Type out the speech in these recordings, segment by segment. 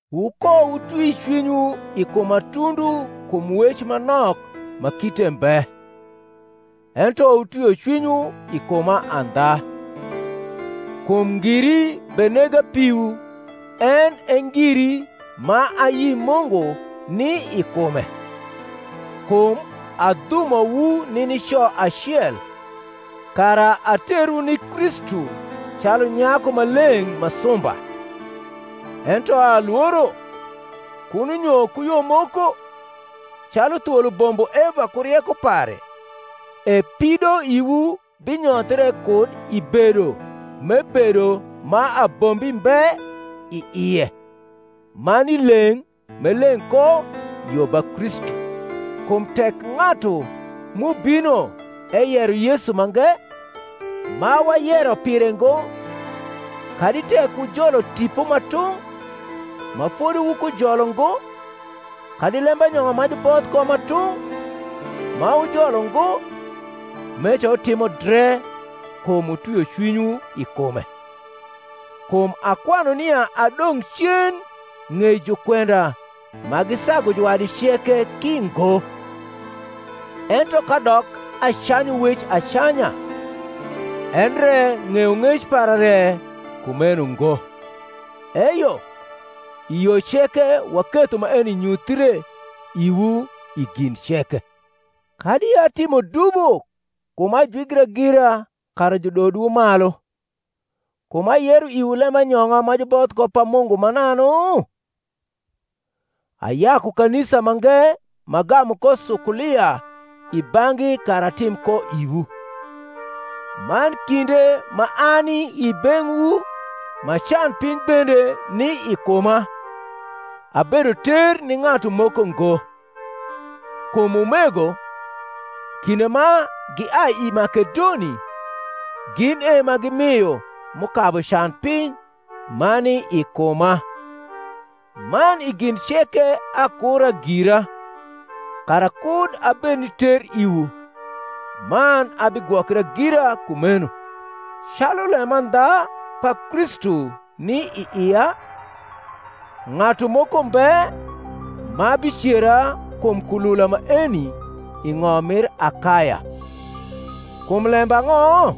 Wukowutwi cwinywu i kuma tundu kum wec ma nok ma kite mbe: ento wutwio cwinywu i kuma andha. Kum ngiri benega piwu en e ngiri ma ayi Mungu ni i kume: kum adhumowu ni nico acel, kara aterwu ni Kristu calu nyaku ma leng’ ma sumba. Ento alworo, kuno nyo ku yo moko, calu thwol ubombo Eva ku rieko pare, e pidoiwu binyothre kud i bedo m’ebedo ma abombi mbe i ie man i leng’ m’e leng’ ko yo ba Kristu. Kum tek ng’atu m’ubino eyero Yesu mange, ma wayero pire ngo, kadi tek wujolo tipo ma tung’, ma fodi wukujolo ngo, kadi lembanyong’a ma juboth ko ma tung’, ma wujolo ngo, meca wutimo dre kum wutwio cwinywu i kume. Kum akwanu nia adong’ cen ng’ei jukwenda ma gisagu juwadi ceke ki ngo. Ento kadok acanyu wec acanya, endre ng’eyong’ec para re kumeno ngo; eyo, i yo ceke waketho maeni nyuthie iwu i gin ceke. Kadi atimo dubo kum ajwigra gira kara judodwu malu, kum ayero iwu lembanyong’a ma juboth ko pa Mungu mananu? Ayaku kanisa mange m’agamu ko sukulia i bang’gi kara atim ko iwu; man kinde ma ani i beng’wu ma can piny bende ni i kuma, abedo ter ni ng’atu moko ngo: kum umego, kinde ma giai i Makedoni, gin e ma gimio m’ukabu can piny ma ni i kuma; man i gin ceke akura gira kara kud abed ni ter iwu, man abigwokra gira kumeno. Calu lemandha pa Kristu ni i ia, ng’atu moko mbe ma bicera kum kulula maeni i ng’om mir Akaya. Kum lembang’o?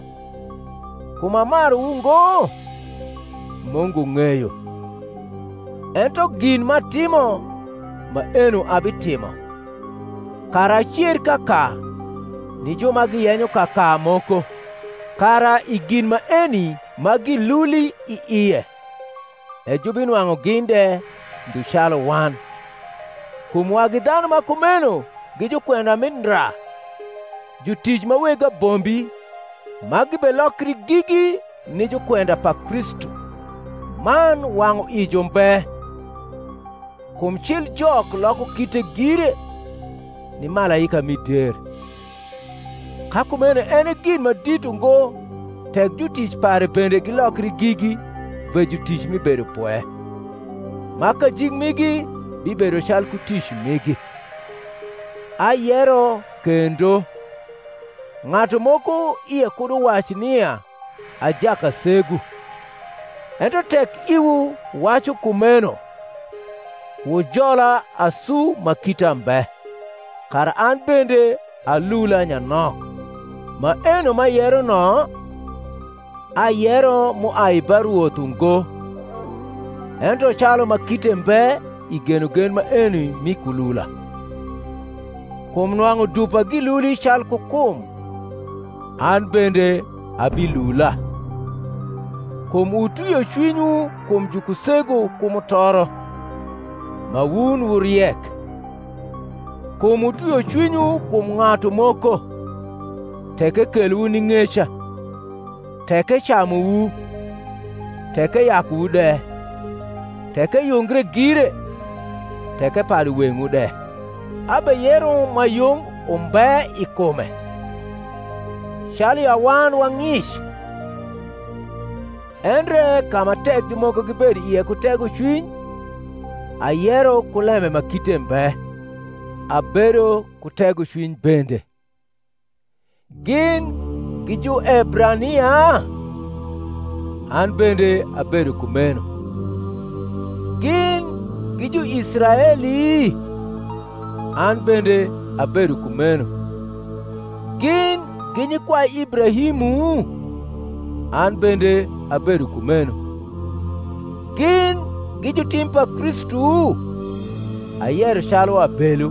kum amaruwu ngo? Mungu ng’eyo. Ento gin m’atimo, maeno abitimo, kara acer kaka ni ju ma giyenyo kaka moko; kara i gin maeni ma giluli i ie, e jubinwang’u gin de ndhu calu wan. Kum wagi dhanu ma kumeno gi jukwenda mi ndra, jutic ma weg abombi, ma gibelokri gigi ni jukwenda pa Kristu. Man wang’uijo mbe; kum cil Jok loko kite gire, ni malaika mi der. Ka kumeno en e gin ma dit ungo tek jutic pare bende gilokri gigi ve jutic mi bedopwe, ma kajik migi bibedo calku tic migi. Ayero kendo, ng’atu moko ie kud uwac nia a jakasegu; ento tek iwu wacu kumeno, wujola asu ma kita mbe, kara an bende alula nyanok. Maeno m’ayero no, ayero m’uai ba Rwoth ungo, ento calu ma kite mbe i genogen maeni mi kulula. Kum nwang’u dupa giluli calku kum, an bende abilula. Kum wutwio cwinywu kum jukusegu ku mutoro, ma wun wu riek. Kum wutwio cwinywu kum ng’atu moko, tek ekelowu ni ng’eca, tek ecamuwu, tek eyakuwu de, tek eyungre gire, tek epadu weng’wu de. Abeyero ma yung umbe i kume, calu ya wan wa ng’ic. Endre ka ma tek ju.. moko gibedo ie ku tegocwiny (ayero ku lembe ma kite mbe), abedo ku tegocwiny bende. Gin gi Juebrania? an bende abedo kumeno. Gin gi Juisraeli? an bende abedo kumeno. Gin gi nyikwai Ibrahimu? an bende abedo kumeno. Gin gi jutim pa Kristu? (Ayero calu abelu)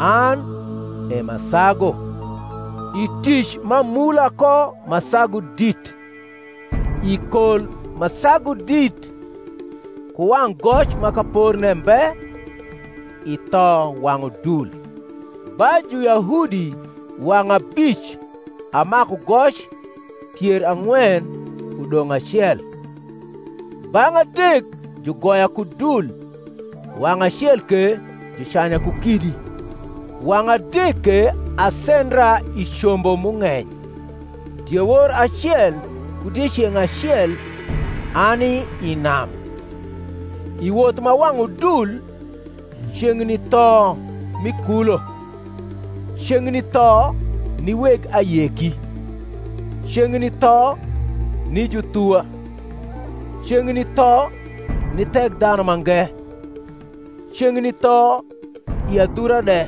an e m’asagu; i tic m’amula ko ma sagu drt, i kol ma sagu dit, ku wang’ goc ma kaporne mbe, i tho wang’ udul. Ba Juyahudi wang’ abic amaku goc pier ang’wen udong’ acel. Bang’ adek jugoya ku dul, wang’ acel ke jucanya ku kidi, wang’ adek ke asendra i combo m’ung’eny, diewor acel ku dieceng’ acel ani i nam; i woth ma wang’ udul, ceng’ni tho mi kulo, ceng’ni tho ni weg ayeki, ceng’ni tho ni juthuwa, ceng’ni tho ni Thekdhanumange, ceng’ni tho i adhura de,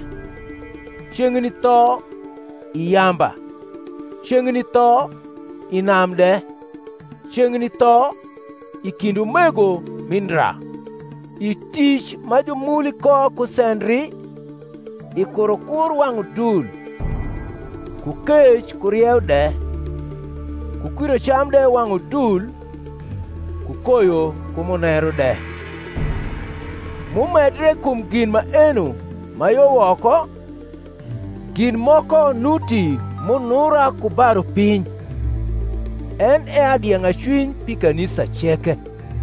ceng’ni tho i yamba, ceng’ni tho i nam de, ceng’ni tho i kind umego mi ndra; i tic ma jumuli ko ku sendri, i kurokur wang’ udul, ku kec ku rieu de, ku kwirocam de wang’ udul, ku koyo ku muneru de. M’umedre kum gin maeno ma yo woko, gin moko nuti m’unura ku ba rupiny, en e adieng’acwiny pi kanisa ceke.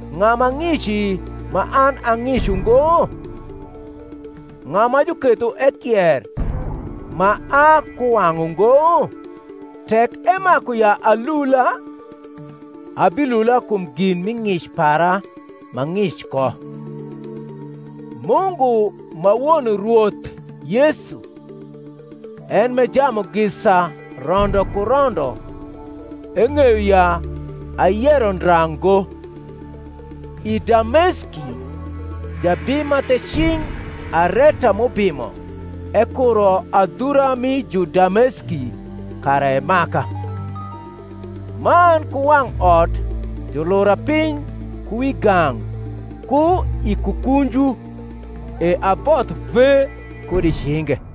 Ng’a ma ng’ici, ma an a ng’ic ungo? ng’a ma juketho ekier, ma a kuwang’ ungo? Tek emaku ya alula, abilula kum gin mi ng’ic para m’ang’ic ko. Mungu ma Won Rwoth Yesu, en m’e jamugisa rondo ku rondo eng’eyo ya ayero ndra ngo. I Dameski jabim ma the cing Areta m’ubimo ekuro adhura mi Judameski kara emaka: man ku wang’ot julura piny ku wi gang’ ku i kukunju, e aboth ve kud i cinge.